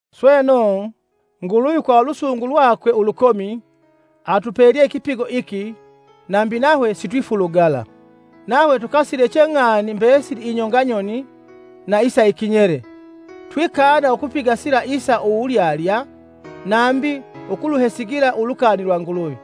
Sweno, Nguluvi kwa ulusungu lwakwe ulukomi, atupelye ikipigo iki nambi nahwe sitwifulugala. Nahwe tukasileche ng'ani mbesili inyonga nyoni na isa ikinyele. Twikana ukupiga sila isa wulyalya nambi ukuluhesigila ulukani lwa Nguluvi,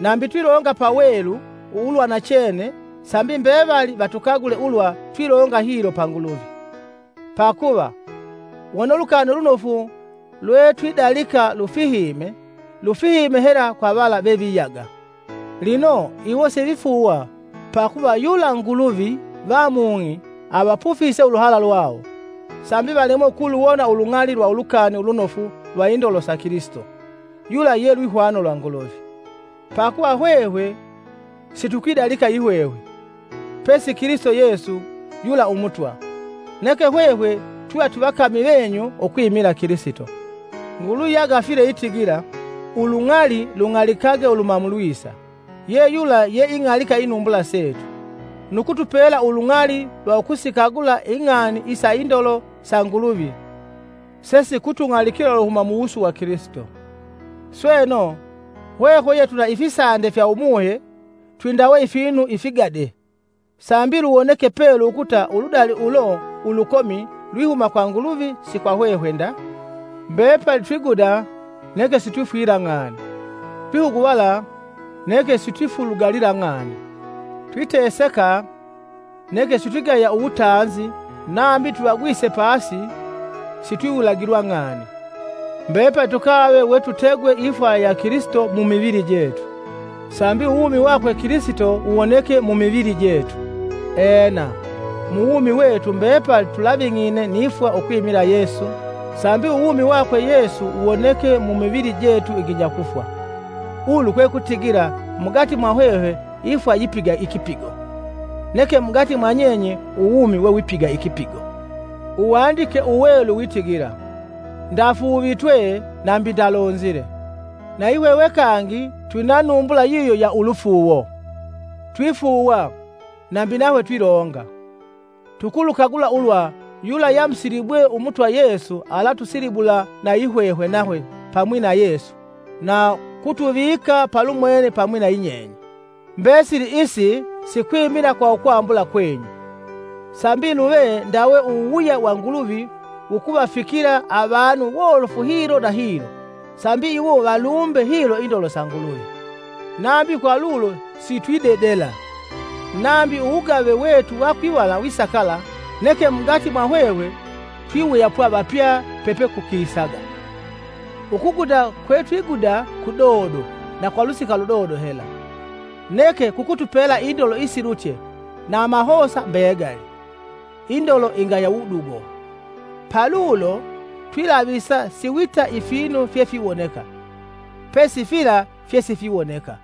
nambi twilonga pawelu ulwanachene sambi mbevali vatukagule ulwa twilonga hilo pa Nguluvi. pakuva, wone Ulukani Ulunofu lwetwidalika lufihime, lufihime hela kwa vala veviyaga. Lino iwo sivifuuwa pakuva yula nguluvi va mung'i avapufise uluhala lwawo sambi valemwe ukuluwona ulung'ali lwa Ulukani Ulunofu lwa indolo sa Kilisito, yula ye lwihwano lwa Nguluvi. Pakuva hwehwe situkwidalika yihwehwe, pesi Kilisito Yesu yula Umutwa, neke hwehwe twiva twivakami venyu ukwimila Kilisito. Nguluvi yagafile itigila, “Ulung'ali lung'alikage uluhuma mulwisa,” yeyula yeing'alika inumbula setu, nu kutupela ulung'ali lwa ukusikagula ing'ani isa indolo sa Nguluvi sesikutung'alikila uluhuma muwusu wa Kilisito. Sweno, hwehwe yetwina ifisande fya Umuhe, twindawe ifinu ifigade, sambi luwoneke pelu ukuta uludali ulo ulukomi lwihuma kwa Nguluvi si kwa hwehwe nda. Mbepali twiguda, neke sitwifwila ng'ani, twihuguvala neke sitwifulugalila ng'ani; twiteseka, neke sitwigaya uwutanzi nambi twivagwise pasi, sitwiwulagilwa ng'ani. Mbepali tukave we tutegwe ifwa ya Kilisito mumivili jetu, sambi uwumi wakwe Kilisito wuwoneke mumivili jetu. Ena, muwumi wetu mbepali tulaving'ine ni fwa ukwimila Yesu, sambi uwumi wakwe Yesu wuwoneke mumivili jetu iginya kufwa. Ulu kwe kutigila mugati mwa hwehwe ifwa yipiga ikipigo, neke mugati mwanyenye uwumi wewipiga ikipigo. Uwandike Uwelu witigila, “Ndafuuvitwe nambi ndalonzile.” Nayihwehwe kangi twina numbula yiyo ya ulufuuwo. Twifuuwa, nambi nahwe twilonga. Tukulukagula ulwa yula yeamusilibwe Umutwa Yesu alatusilibula na yihwehwe nahwe pamwi na Yesu na kutuvika palumwene pamwi na yinyenye. Mbesili isi sikwimila kwa ukwambula kwenyu, sambi luve ndawe uwuwuya wa Nguluvi wukuvafikila avanu wolofu hilo na hilo, sambi iwo valumbe hilo indolo sa Nguluvi. Nambi kwa ulo sitwidedela; nambi uwugave wetu wa kwivala wisakala, neke mugati mwahwehwe twiwuyapwa vapya pepekukisaga. Ukuguda kwetwiguda kudodo na kwa lusika ludodo hela; neke kukutupela indolo isilutye na amahosa mbegali, indolo ingaya wudugo. Palulo twilavisa si wita ifinu fyefiwoneka, pesi fila fyesifiwoneka.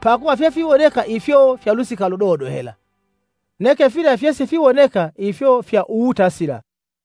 Pakuva fyefiwoneka ifyo fya lusika ludodo hela; neke fila fyesifiwoneka ifyo fya uwutasila.